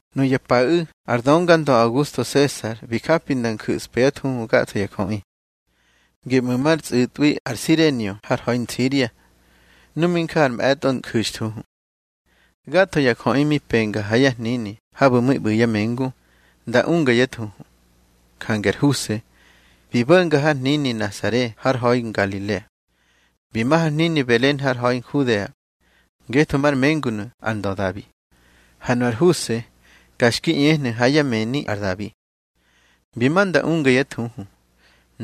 Nuya paꞌu̱ ar döngandö Augusto Sesar bi japi nda nju̱spa yá thuhu gatho ya jöꞌi. Geꞌmu̱ mar tsꞌu̱tꞌwi ar Sirenio har ha̱i Nsiria, nu mi nja ar mꞌe̱tꞌo nju̱xthuhu. Gatho ya jöꞌi mi penga ha yá hnini habu̱ mi ꞌbu̱ yá mengu, nda unga yá thuhu. Jange ar Huse bi bo̱nga har hnini Nasare har ha̱i Ngalilea, bi ma har hnini Belen har ha̱i Nhudea, ngetho mar mengunu̱ ar ndö Dabi, ha nu ar Huse ka xki ꞌñehnu̱ ha yá mëni ar Dabi. Bi ma nda unga yá thuhu,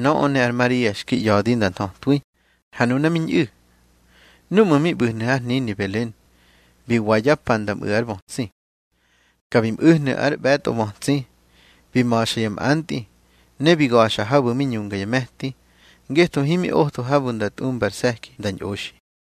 nöꞌö ne ar Maria xki ꞌya̱di nda nthötwi, ha nuna mi ñꞌu̱. Núꞌmu̱ mi ꞌbu̱hnu̱ har hnini Belen, bi wa yá pa nda mꞌu̱ ár bötsi. Ka bi mꞌu̱hnu̱ ár ꞌbe̱tꞌo bötsi, bi ma̱xa ya mꞌantꞌi, ne bi ga̱xa habu̱ mi ñunga ya me̱ti, ngetho himi otho habu̱ nda tꞌumba ar se̱ki nda ñꞌoxi.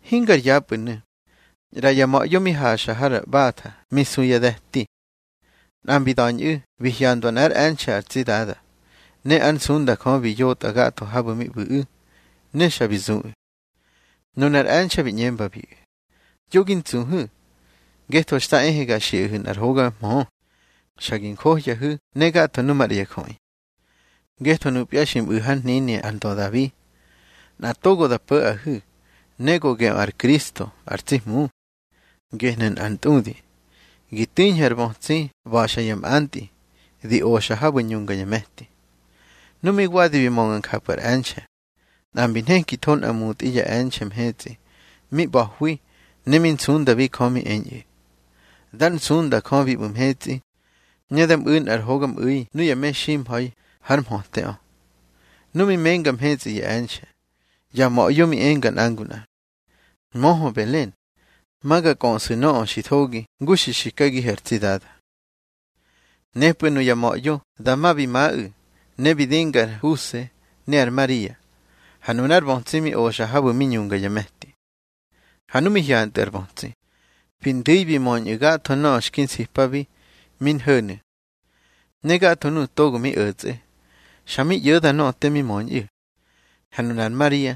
Hingar yapꞌu̱nu̱, ꞌra ya ma̱ꞌyo mi haxa har ꞌbatha mi su yá de̱ti. Nꞌa mbi da̱ñꞌu̱ bi hyandwa nꞌár e̱nxe̱ ar tsi Dada, ne ár nsunda Jö bi yotꞌa gatho habu̱ mi ꞌbu̱ꞌu̱, ne xa bi zuꞌu̱. Nunar e̱nxe̱ bi ꞌñembabiꞌu̱: —Yo gi ntsuhu̱, ngetho xta ehe ga xiꞌahu̱ nꞌar hoga mhö, xa gi njohyahu̱ ne gatho nu maꞌra ya jöꞌi. Ngetho nupya xi mꞌu̱ hár hnini ar ndö Dabi, nꞌa togo da po̱ꞌahu̱, ne go geꞌö ar Kristo ar tsi Hmu. Gehnu̱ nꞌar ntꞌudi: Gi tiñhu̱ ar bötsi ꞌba̱xa ya mꞌantꞌi, di oxa habu̱ ñunga ya me̱ti. Nu mi wadi bi mönga njapꞌu̱ ar e̱nxe̱, nꞌa mbi nhekitho nꞌa mutꞌi ya e̱nxe̱ mhetsꞌi mi ꞌba̱hwi, ne mi nsundabi Jö mi eñꞌu̱: Dar nsunda Jö bi ꞌbu̱ mhetsꞌi, ne da mꞌu̱i nꞌar hogamꞌu̱i nuya meximha̱i hár mhöteꞌö. Nu mi menga mhetsꞌi ya e̱nxe̱, ya ma̱ꞌyo mi enga nꞌa ngu nꞌa: —Möhö Belen, ma ga kꞌöꞌsu̱ nöꞌö xi thogi ngu xi xikagihu̱ ar tsi Dada. Nepꞌu̱ nuya ma̱ꞌyo dama bi maꞌu̱, ne bi dinga ar Huse ne ar Maria, ha nunár bötsi mi oxa habu̱ mi ñunga ya me̱ti. Ha nu mi hyantꞌu̱ ar bötsi, bi ndu̱i bi möñꞌu̱ gatho nöꞌö xki nsipabi mi nho̱nu̱. Ne gatho nuꞌu̱ togo mi o̱tsꞌe, xa mi ꞌyo̱da nöꞌö te mi möñꞌu̱. Ha nunar Maria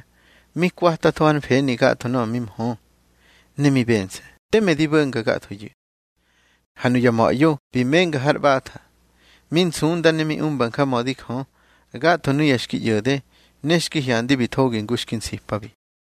mi kwatatho hár mfeni gatho te mi mhö, ne mi bense̱ teme ndi bo̱nga gathoyu̱. Ha nuya ma̱ꞌyo bi menga har ꞌbatha, mi nsunda ne mi umba njamödi Jö, gatho nuya xki ꞌyo̱de ne xki hyandi bi thogi ngu xki nsipabi.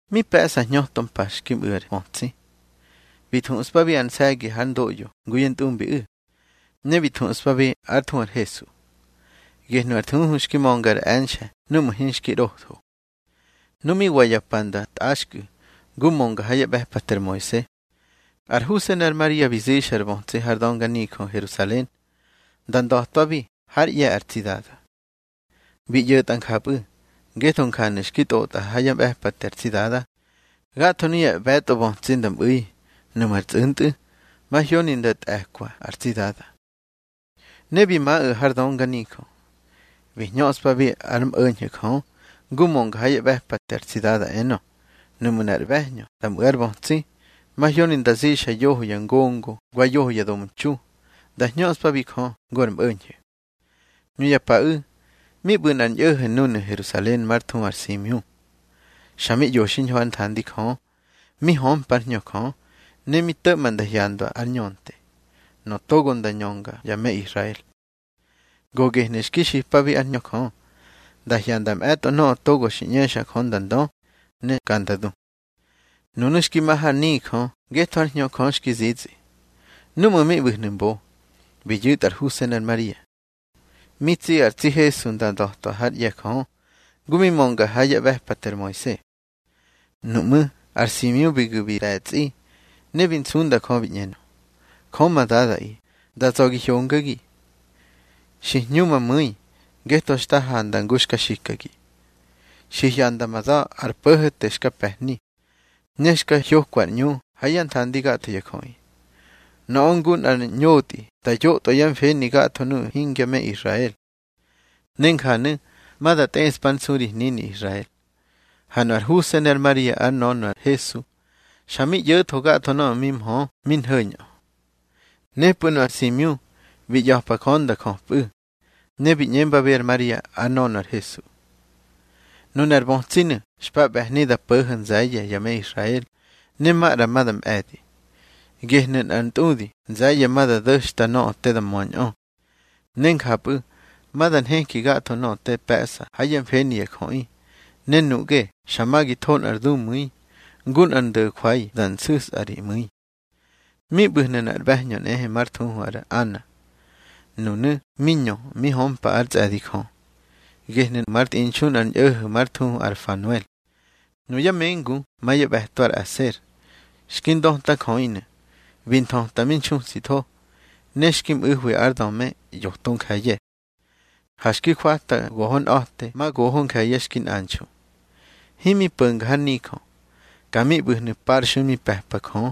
Mi pe̱ꞌsa hñöto mpa xki mꞌu̱ ar bötsi, bi thuꞌspabi ar nse̱gi hár ndoꞌyo ngu yá ntꞌumbiꞌu̱. Ne bi thuꞌspabi ár thuhu ar Hesu, gehnu̱ ar thuhu xki mönga ar e̱nxe̱ núꞌmu̱ hinxki ꞌrotho. Nu mi wa ya pa nda tꞌaxkꞌu̱ ngu mönga ha yá ꞌbe̱pate ar Moise, ar Huse ne ar Maria bi zixa ar bötsi har dönganijö Herusalen, nda nda̱twabi hár ꞌye̱ ar tsi Dada. Bi ꞌyo̱tꞌa njapꞌu̱, ngetho njanu̱ xki tꞌotꞌa ha yá ꞌbe̱pate ar tsi Dada: Gatho nuya ꞌbe̱tꞌo bötsi da mꞌu̱i, nuꞌmu̱ ar tsꞌu̱ntꞌu̱, mahyoni nda tꞌe̱kwa ar tsi Dada. Ne bi maꞌu̱ har dönganijö, bi hñöꞌspabi ár mꞌo̱ñho̱ Jö, ngu mönga ha yá ꞌbe̱pate ar tsi Dada, enö: Nuꞌmu̱ nꞌar ꞌbe̱hñö nda mꞌu̱ ár bötsi, mahyoni nda zixa yoho ya ngongo wa yoho ya domtxu, nda hñöꞌspabi Jö ngu ar mꞌo̱ñho̱. Nuya paꞌu̱ mi ꞌbu̱ nꞌar ñꞌo̱ho̱ núnu̱ Herusalen már thuhu ar Simiu. Xa mi ꞌyo xiñho hár nthandi Jö, mi hömpa ár Hñö Jö, ne mi to̱ꞌma nda hyanda ar Ñönte, nöꞌö togo ma nda ñönga ya me Israel. Go gehnu̱ xki xipabi ár Hñö Jö, nda hyanda mꞌe̱tꞌo nöꞌö togo xki ꞌñexa Jö nda ndö, ne ka nda du. Nunu̱ xki ma har nijö ngetho ár Hñö Jö xki zitsꞌi. Núꞌmu̱ mi ꞌbu̱hnu̱ mbo, bi yu̱tꞌa ar Huse ne ar Maria, mi tsi ar tsi Hesu nda nda̱twa hár ꞌye̱ Jö, ngu mi mönga ha yá ꞌbe̱pate ar Moise. Nuꞌmú̱ ar Simiu bi gu̱ bi de̱tsꞌi, ne bi nsunda Jö bi ꞌñenö: Jö ma Dadaꞌi, da za̱ gi hyongagi. Xi hñu ma mu̱i, ngetho xta handa ngu xka xikagi. Xi hyanda ma da̱ ar Po̱ho̱te xka pe̱hni, ne xka hyokwa ár ꞌñu ha yá nthandi gatho ya jöꞌi. Nöꞌö ngu nꞌar ñotꞌi da yotꞌwa yá mfeni gatho nuꞌu̱ hingya me Israel, ne njanu̱ ma da tꞌeꞌspa ár nsu ri hnini Israel. Ha nu ar Huse ne ar Maria ár nönö ar Hesu, xa mi ꞌyo̱tho gatho nöꞌö mi mhö mi nho̱ñꞌö. Nepꞌu̱ nu ar Simiu bi ꞌya̱pa Jö nda jöpꞌu̱, ne bi ꞌñembabi ar Maria ár nönö ar Hesu: —Nunar bötsinu̱ xpa ꞌbe̱hni da po̱ho̱ nze̱ye̱ ya me Israel, ne maꞌra ma da mꞌe̱di. Gehnu̱ nꞌar ntꞌudi nze̱ye̱ ma da do̱xta nöꞌö te da möñꞌö. Ne njapꞌu̱ ma da nheki gatho nöꞌö te pe̱ꞌsa ha yá mfeni ya jöꞌi. Ne nuꞌge xa ma gi tho nꞌar dumu̱i, ngu nꞌar ndo̱jwai da nsu̱sꞌa ri mu̱i. Mi ꞌbu̱hnu̱ nꞌar ꞌbe̱hñö nꞌehe már thuhu ar Ana, nunu̱ mi ñö mi hömpa ár tsꞌe̱di Jö. Gehnu̱ már tꞌinxu nꞌar ñꞌo̱ho̱ már thuhu ar Fanuel, nuyá mengu ma yá ꞌbe̱to ar Aser. Xki ndötajöꞌinu̱, bi nthöti mi nxutsitho, ne xki mꞌu̱hwi ár döme yoto nje̱ye̱. Ha xki jwata gohonꞌa̱te ma goho nje̱ye̱ xki nꞌanxu. Himi po̱nga har nijö, ka mi ꞌbu̱hnu̱ parxui mi pe̱pa Jö,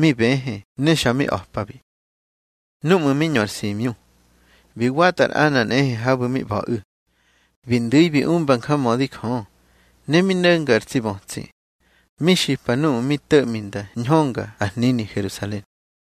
mi bëhë ne xa mi a̱pabi. Núꞌmu̱ mi ñö ar Simiu, bi watꞌa ar Ana nꞌehe habu̱ mi ꞌba̱ꞌu̱. Bi ndu̱i bi umba njamödi Jö, ne mi no̱nga ar tsi bötsi, mi xipa nuꞌu̱ mi to̱ꞌmi nda ñhönga ar hnini Herusalen.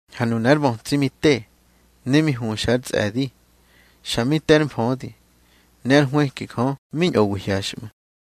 Ha nunar bötsi mi te, ne mi huxa ár tsꞌe̱di. Xa mi te ár mfödi, ne ár nhwëki Jö mi ñꞌowi hyaxꞌmu̱.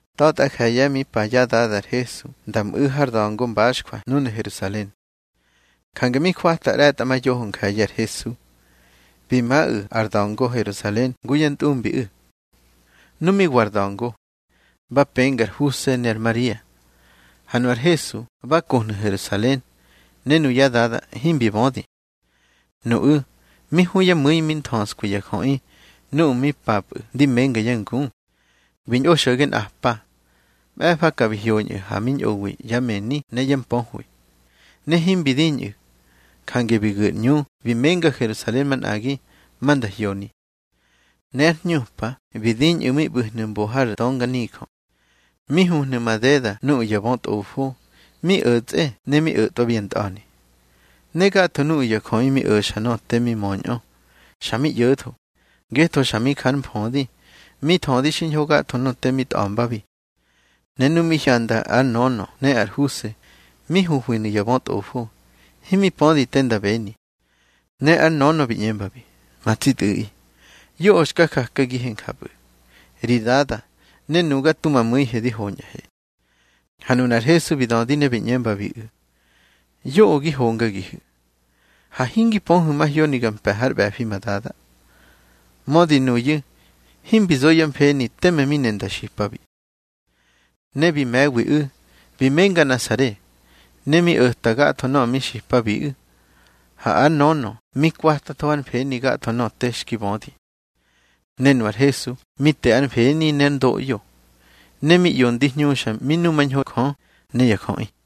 Ta̱tꞌa je̱ye̱ mi pa yá dada ar Hesu nda mꞌu̱ har da̱ngo mbaxjwa núnu̱ Herusalen. Jange mi jwata ꞌre̱tꞌamayoho nje̱ye̱ ar Hesu, bi maꞌu̱ ar da̱ngo Herusalen ngu yá ntꞌumbiꞌu̱. Nu mi wa ar da̱ngo, ba penga ar Huse ne ar Maria. Ha nu ar Hesu ba kohnu̱ Herusalen, ne nuyá dada himbi bödi. Nuꞌu̱ mi hu yá mu̱i mi nthöskwi ya jöꞌi nuꞌu̱ mi papꞌu̱ ndi menga yá ngu. Bi ñꞌo xo̱ge nꞌapa. Mꞌe̱fa ka bi hyoñꞌu̱ ha mi ñꞌowi yá mëni ne yá mpöhwi. Ne himbi diñꞌu̱, jange bi gu̱ ar ꞌñu bi menga Herusalen manꞌagi, ma nda hyoni. Ne ár hñupa bi diñꞌu̱ mi ꞌbu̱hnu̱ mbo har dönganijö, mi huhnu̱ madeda nuꞌu̱ ya bötꞌofo, mi o̱tsꞌe ne mi o̱tꞌwabi ya ntꞌa̱ni. Ne gatho nuꞌu̱ ya jöꞌi mi o̱xa nöꞌö te mi möñꞌö, xa mi ꞌyo̱tho, ngetho xa mi jár mfödi, mi thödi xiñho gatho nöꞌö te mi tꞌa̱mbabi. Ne nu mi hyanda ár nönö ne ar Huse mi huhwinu̱ ya bötꞌofo, himi pödi te nda beni. Ne ár nönö bi ꞌñembabi: —Ma tsi tꞌu̱ꞌi, yoꞌö xka jakagihe njapꞌu̱. Ri dada ne nuga tu ma mu̱ihe di hoñꞌahe. Ha nunar Hesu bi dödi ne bi ꞌñembabiꞌu̱: —Yoꞌö gi hongagihu̱. Ha hingi pöhu̱ mahyoni ga mpe̱ hár ꞌbe̱fi ma Dada. Mödi nuyu̱ himbi zo yá mfeni teme mi ne nda xipabi. Ne bi me̱wiꞌu̱, bi menga Nasare, ne mi o̱ta gatho nöꞌö mi xipabiꞌu̱. Ha ár nönö mi kwatatho hár mfeni gatho nöꞌö te xki bödi. Ne nu ar Hesu mi te ár mfeni ne ár ndoꞌyo, ne mi ꞌyo ndi hñuxa mi numañho Jö ne ya jöꞌi.